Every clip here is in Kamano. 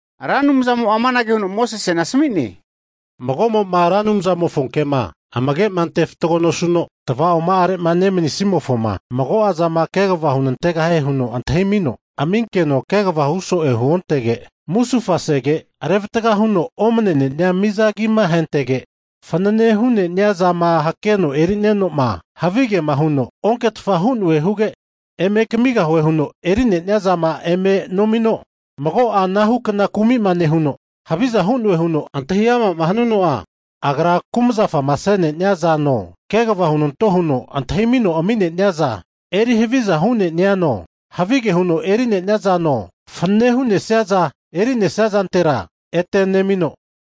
Ra Anumzamo'a amanage huno Mosesena asami'ne, Mago'mo'ma Ra Anumzamofo kema amagema ante fatgo nosuno, tava'oma'are'ma nemanisimofoma mago'azama kegava hunantegahie huno antahimino ami'nenkeno kegava huso'e huontege, musufasege revatga huno omnene'nia miza agima ahentege, fanane hu'ne'nia zama hakeno eri'nenoma havigema huno onketfa hu'noe huge, eme kamigahue huno eri'ne'nia zama eme nomino, mago'a anahukna kumi'ma nehuno, haviza hu'noe huno antahi'amama hanuno'a, agra kumzafama se'nenia zano, kegava hunanto huno antahimino ami'neniaza eri havia hu'neniano, havige huno eri'nenia zano, fanane hu'nesiaza eri'nesia zantera ete nemino,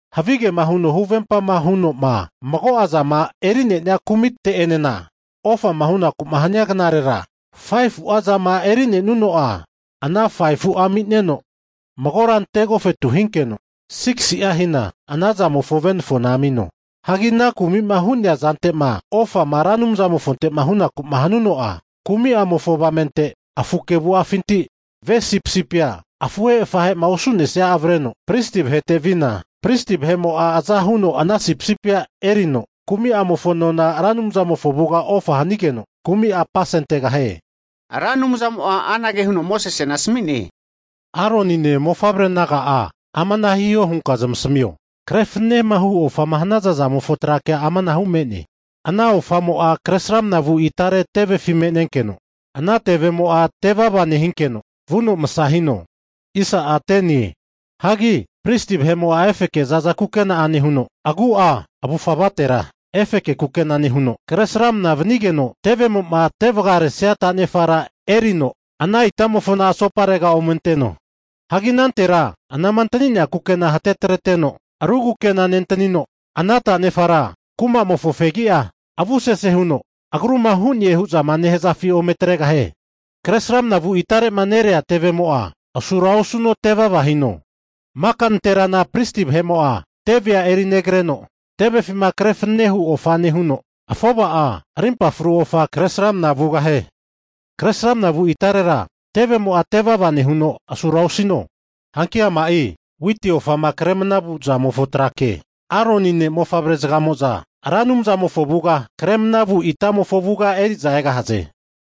havige'ma huno huvempa hu'noma mago'zama eri'nenia kumite'enena, ofama hunaku'ma hania knarera 5fu'a zama eri'nenuno'a ana 5fu'a ami'neno, magora ante agofetu hinkeno, 6si'a hina ana zamofo venafona amino. Hagi ana kumi'ma hu'nea zante'ma ofa'ma Ra Anumzamofonte'ma hunaku'ma hanuno'a, kumi'amofo avamente afu kevu'afinti ve sipisipia afuhe afahe'ma osu'nesia avreno pristi vahete vina, pristi vahe'mo'a aza huno ana sipisipia erino kumi'amofo nona Ra Anumzamofo avuga ofa hanigeno, kumi'a apasentegahie. Ra Anumzamo'a anage huno Mosesena asami'ne, Aronine mofavre naga'a amana hiho hunka zamasamio, kre fananema hu ofama hanaza zamofo tra kea amanahu me'ne, ana ofamo'a kresramana vu itare tevefi me'nenkeno, ana tevemo'a tevava nehinkeno vuno masa hino. Hagi pristi vahe'mo'a efeke za'za kukena nehuno, agu'a avufa avatera efeke kukena nehuno, kresramna vanigeno tevemo'ma tevagaresia tanefara erino, ana itamofona asoparega ome anteno. Hagi anantera anama antani'nea kukena hatetreteno, ru kukena nentanino ana tanefara kuma'mofo fegi'a avusese huno agruma hu'ne hu'zama nehazafi ome atregahie. Kresramna vu itare'ma nerea tevemo'a asura osuno, tevava hino. Maka nanterana pristi vahe'mo'a teve erinegreno, tevefima kre fananene hu ofa nehuno, afova'a rimpafru ofa kresramna vugahie. Kresramna vu itarera, tevemo'a tevava nehuno asura osino. Hanki ama'i witi ofama kre mnavu zamofo tra ke. Aroni ne' mofavre zagamo'za Ra Anumzamofo avuga kremna vu itamofo avuga eri'za egahaze.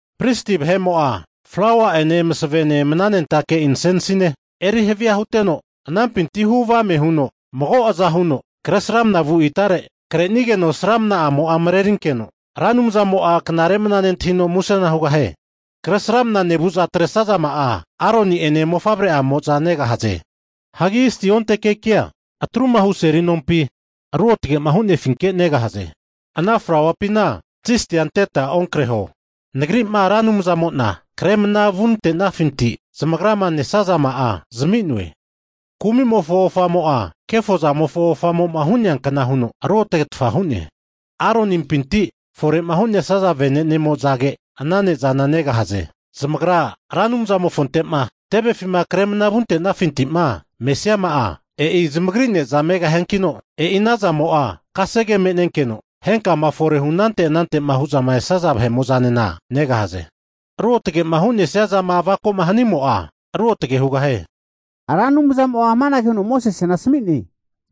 Pristi vahe'mo'a flaua'ene masavene mnanentake insensine eri havia huteno anampinti hu avame huno mago aza huno kresramna vu itare, kre'nigeno sramna'amo'a marerinkeno, Ra Anumzamo'a knare mana nentahino musena hugahie. Kresramna nevu'za atresazama'a Aroni'ene mofavre'amo'za negahaze. Hagi zisti onte kekia atru'ma hu seli nonkumapi ruotagema hu'nefinke negahaze. Ana flauapina zistia anteta onkreho, nagri'ma Ra Anumzamona kremna vu nantesafinti zamagrama nesazama'a zami'noe. Kumi'mofo ofamo'a, kefozamafo ofamo'ma hu'neankna huno ruotagetfa hu'ne. Aronimpinti fore'ma hu'nesaza vene'ne'amozage ana ne'zana negahaze. Zamagra Ra Anumzamofonte'ma tevefima kremna vunte'nafinti'ma mesiama'a, e'i zamagri ne'za megahiankino, e'i ana zamo'a kasege me'nenkeno henkama fore'ma hu anante anante'ma hu'za esaza vahe'mo'zanena negahaze. Ruotage'ma hu'nesia zama avako'ma hanimo'a ruotage hugahie. Ra Anumzamo'a amanage huno Mosesena asami'ne,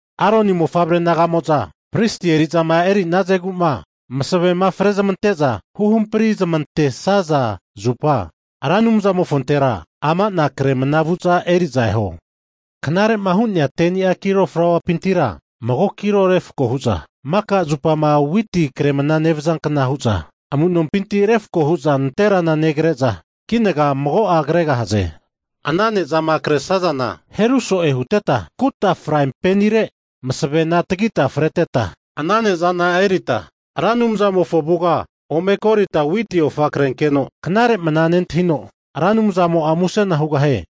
Aroni mofavre naga'mo'za pristi eri'zama eri'nazegu'ma masavema frezmante'za huhampri zmantesaza zupa, Ra Anumzamofontera ama'na kremna vu'za eri'za eho, knarema hu'ne'ni 10ni'a kilo flauapintira mago kilo refako hu'za maka zupama witi kremna nevazankna hu'za, amu'nompinti refako hu'za nanterana negre'za, kinaga mago'a kregahaze. Ana ne'zama retro'ma hanazana heru so'e huteta, ana ne'zama kre sazana kuta fraipanire masavena tagita kreteta ana ne'zana erita Ra Anumzamofo avuga ome golita witi ofa krenkeno knare mana nentahino, Ra Anumzamo'a musena hugahie.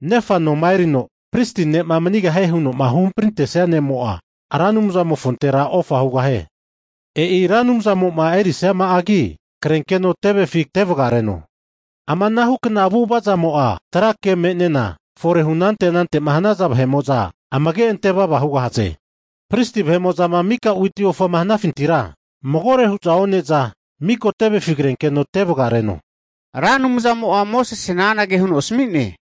Nefa noma erino pristi ne'ma manigahie huno'ma huhamprintesia ne'mo'a Ra Anumzamofontera ofa hugahie. E'i Ra Anumzamo'ma erisiama'agi krenkeno tevefi tevagareno. Ama anahukna avu'avazamo'a trake me'nena fore hu anante anante'ma hanaza vahe'mo'za amage antevava hugahaze. Pristi vahe'mo'zama miko witi ofama hanafintira, magore hu'za one'za, miko tevefi krenkeno tevagareno. Ra Anumzamo'a Mosesena anage huno asami'ne,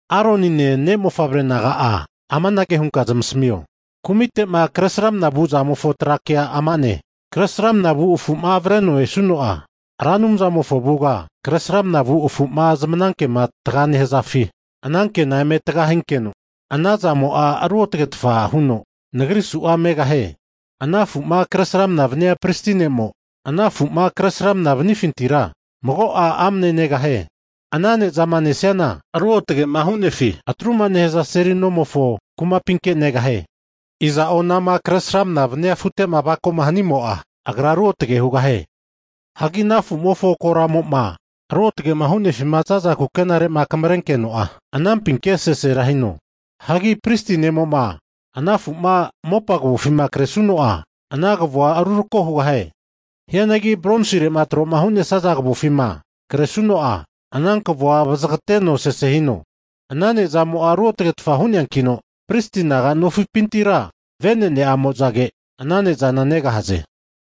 Aronine ne' mofavre naga'a amanage hunka zamasamio, kumite'ma kresramna vu zamofo tra kea ama'ne, kresramna vu afu'ma avreno'ma esuno'a, Ra Anumzamofo avuga kresramna vu afu'ma zamanakema taga nehazafi anankena eme tagahinkeno, ana zamo'a ruotagetfa huno Nagri su'a megahie. Ana afu'ma kresramana vania pristi ne'mo, ana afu'ma kresramna vanifintira, mago'a amne negahie. Ana ne'zama nesiana, ruotage'ma hu'nefi atruma nehaza seli nomofo kumapinke negahie. Iza'o anama kresramna vania afute'ma avako'ma hanimo'a, agra ruotage hugahie. Hagi ana afu'mofo koramo'ma ruotage'ma hu'nefima za'za kukenare'ma akamrenkeno'a, anampinke sesera hino. Hagi pristi ne'mo'ma ana afu'ma mopa kavofima kresuno'a, ana kavo'a rurako hugahie. Hianagi bronsire'ma tro'ma hu'nesaza kavofima kresuno'a, ana kavoa vazagateno sese hino. Ana ne'zamo'a ruotagetfa hu'neankino, pristi naganofipintira venene'amozage ana ne'zana negahaze.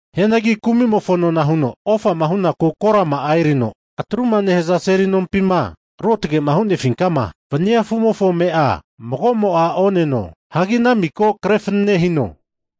Hianagi kumi'mofo nona huno ofama hu'naku korama'a erino atru'ma nehaza seli nompima ruotage'ma hu'nefinkama vania afu'mofo ame'a mago'mo'a oneno. Hagi ana miko kre fanane hino.